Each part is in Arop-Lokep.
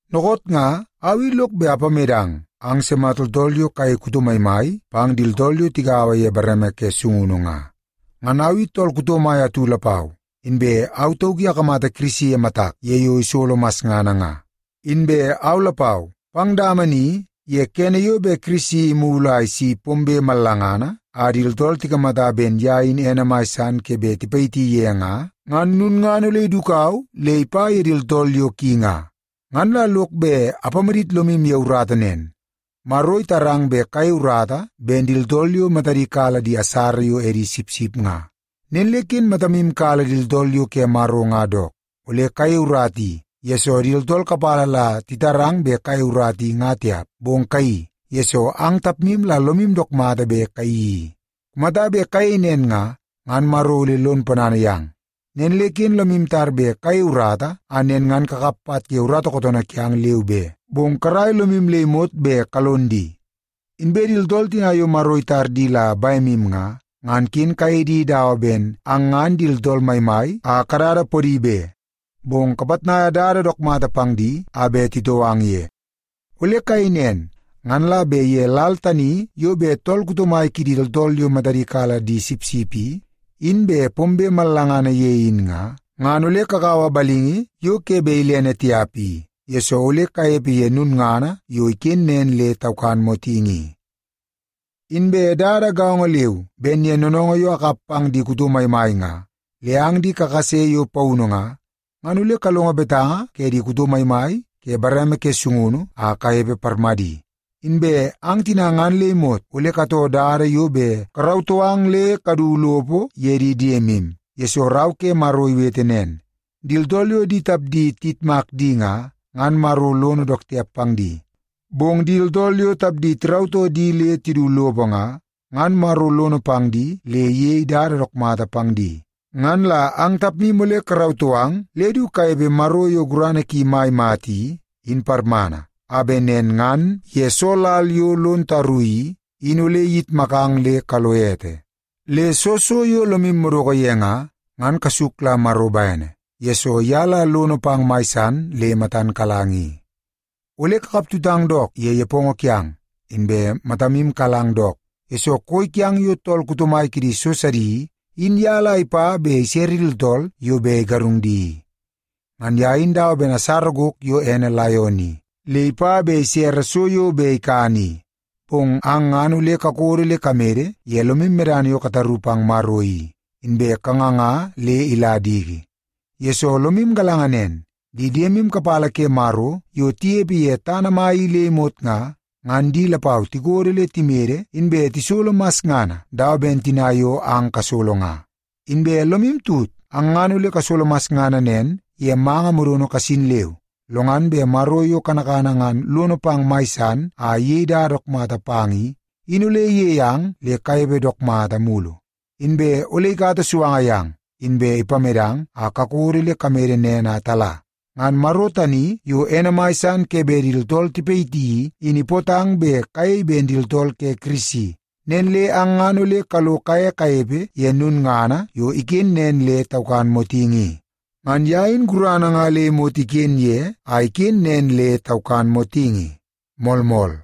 Dookoot nga au i lok bet apamedang ang sima tooltool yo kayei kuto maimai pang di tooltool yo tigaua ye bareme ke sungunu nga. Ngan au i tool kuto mai atu lapau, inbe au tauk i akamata Kirisi ye matak ye yo isolo masngana nga. Inbe au lapau, pang dama ni ye kene yo bet Kirisi imulu a isi pombe mallangana a di tooltool tikamata ben ye in ene mai san ke bet tipayiti ye nga, ngan lulngana ole idukau le ipa ye di tooltool yo ki nga. Ngan la lok bet apamadit lomu ye urata nen. Maro itarang bet kayei urata ben di tooltool yo matadi kala di asara yo edi sipsip nga. Nen le ken matamu kala di tooltool yo ke Maro nga dook. Ole kayei urata i, yesoo di tooltool kapala la titarang bet kayei urata i nga tiap, bong kayeii, yesoo ang tapmu la lomu dook mata bet kayeii i. Kumata bet kayei nen nga, ngan Maro ole lon ponana yang. Nen le ken lomu tar bet kayei urata a nen ngan kakap pat ye urata kootoonoo kiang, leu be, bong karai lomu le imot bet kalon di. Inbe di tooltool tina yo Maro itar di la bemu nga, ngan ken kayei di dawa ben ang ngan di tooltool maimai a kadada podi be. Bong kapitnaia dada dook mata pang di a bet titoo ang ye. Ole kayei nen, ngan la bet ye lal tani yo bet tool kuto mai kidi tooltool yo matadi kala di sipsip i, in bet pombe mallangana ye in nga, ngan ole kakaua balingi yo ke bet ilene tiap i, yesoo ole kanepe ye lulngana yo iken nen le taukan motingi i. Inbe dada gaongo leu ben ye noonoongoo yo akap pang di kuto maimai nga, le ang di kakase yo paunu nga, ngan ole kalongo betanga ke di kuto maimai ke bareme ke sungunu a kanepe parmadi. Inbe ang tina ngan le imot ole katoo dada yo bet karautoo ang le kadu lopo ye di diemu, yesoo Rau ke Maro iwete nen, “Di tooltool yo di tapdi tiyitmak di nga, ngan Maro lono dook tiap pang di. Bong di tooltool yo di tapdi tirautoo di le tidu lopo nga, ngan Maro lono pang di le iyei dada dook mata pang di.” Ngan la ang tapmu ole karautoo ang le du kanepe Maro yo gurana ki mai mata i, in parmana, a bet nen ngan ye soo lal yo lon taru i, in ole iyitmakang le kalo ete. Le soo so yo lomu madoko ye nga, ngan kasuk la Maro bene, yesoo ye la lono pang mai san le matan kalang i. Ole kakaptutang dook ye nepongo kiang, inbe matamu kalang dook, yesoo koi kiang yo tool kuto mai kidi so sidi i, in ye la ipa bet isere di tooltool yo bet igarung di i. Ngan ye in dawa ben asara gok yo ene laion i, le ipa bet isere so yo bet ikani i. Bong ang ngan ole kakodo le kamede ye lomu medana yo kataru pang Maro i, inbe kanganga le ila diki. Yesoo, lomu galanga nen, di diemu kapala ke Maro yo tinepe ye tana mai i le imot nga, ngan di lapau tikodo le timede inbe tisolo masngana dawa ben tina yo ang kasolo nga. Inbe lomu tut, ang ngan ole kasolo masngana nen ye manga modono kasin leu, lo ngan bet Maro yo kanakana ngan lono pang mai san a iyei dada dook mata pang i, in ole iyei ang le kanepe dook mata mulu. Inbe ole ikata suanga yang, inbe ipamedang a kakodo le kamede nen a tala. Ngan Maro tani yo ene mai san ke bet di tooltool tipayiti i, in ipootang bet kayei ben di tooltool ke Kirisi, nen le ang ngan ole kalo kaye kanepe ye lulngana yo iken nen le taukan motingi i. Ngan ye in gurana nga le imot iken ye a iken nen le taukan motingi. Moolmool.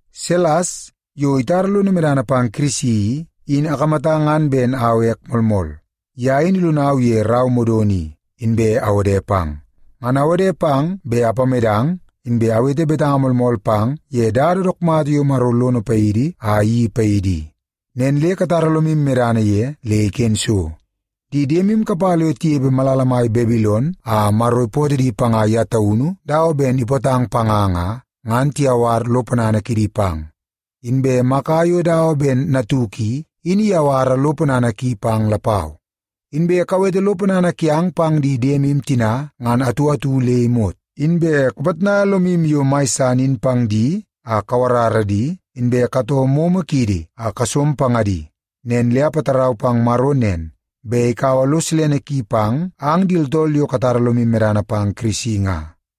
Silas, yo itara lono medana pang Kirisi i, in akamata ngan ben au ek moolmool. Ye in ilonau ye rau modono i, inbe awode pang. Ngan awode pang bet apamedang, inbe awete betanga moolmool pang ye dada dook mata yo Maro lono paidi a iyeii paidi i. Nen le katara lomu medana ye le iken so. Di diemu kapala yo tinepe malala mai Babilon a Maro ipootoo di panga ye taunu dawa ben ipootang panga nga, ngan tiyawar lo ponana kidi pang. Inbe Maka yo dawa ben natuk i, in iyawara lo ponana ki pang lapau. Inbe kawete lo ponana kiang pang di diemu tina ngan atu atu le imot, inbe kapitnaia lomu yo mai san in pang di a kawarara di, inbe katoo momo kiidi a kasom pangadi. Nen le apatarau pang Maro nen, bet ikaua lo silene ki pang ang di tooltool yo katara lomu medana pang Kirisi nga.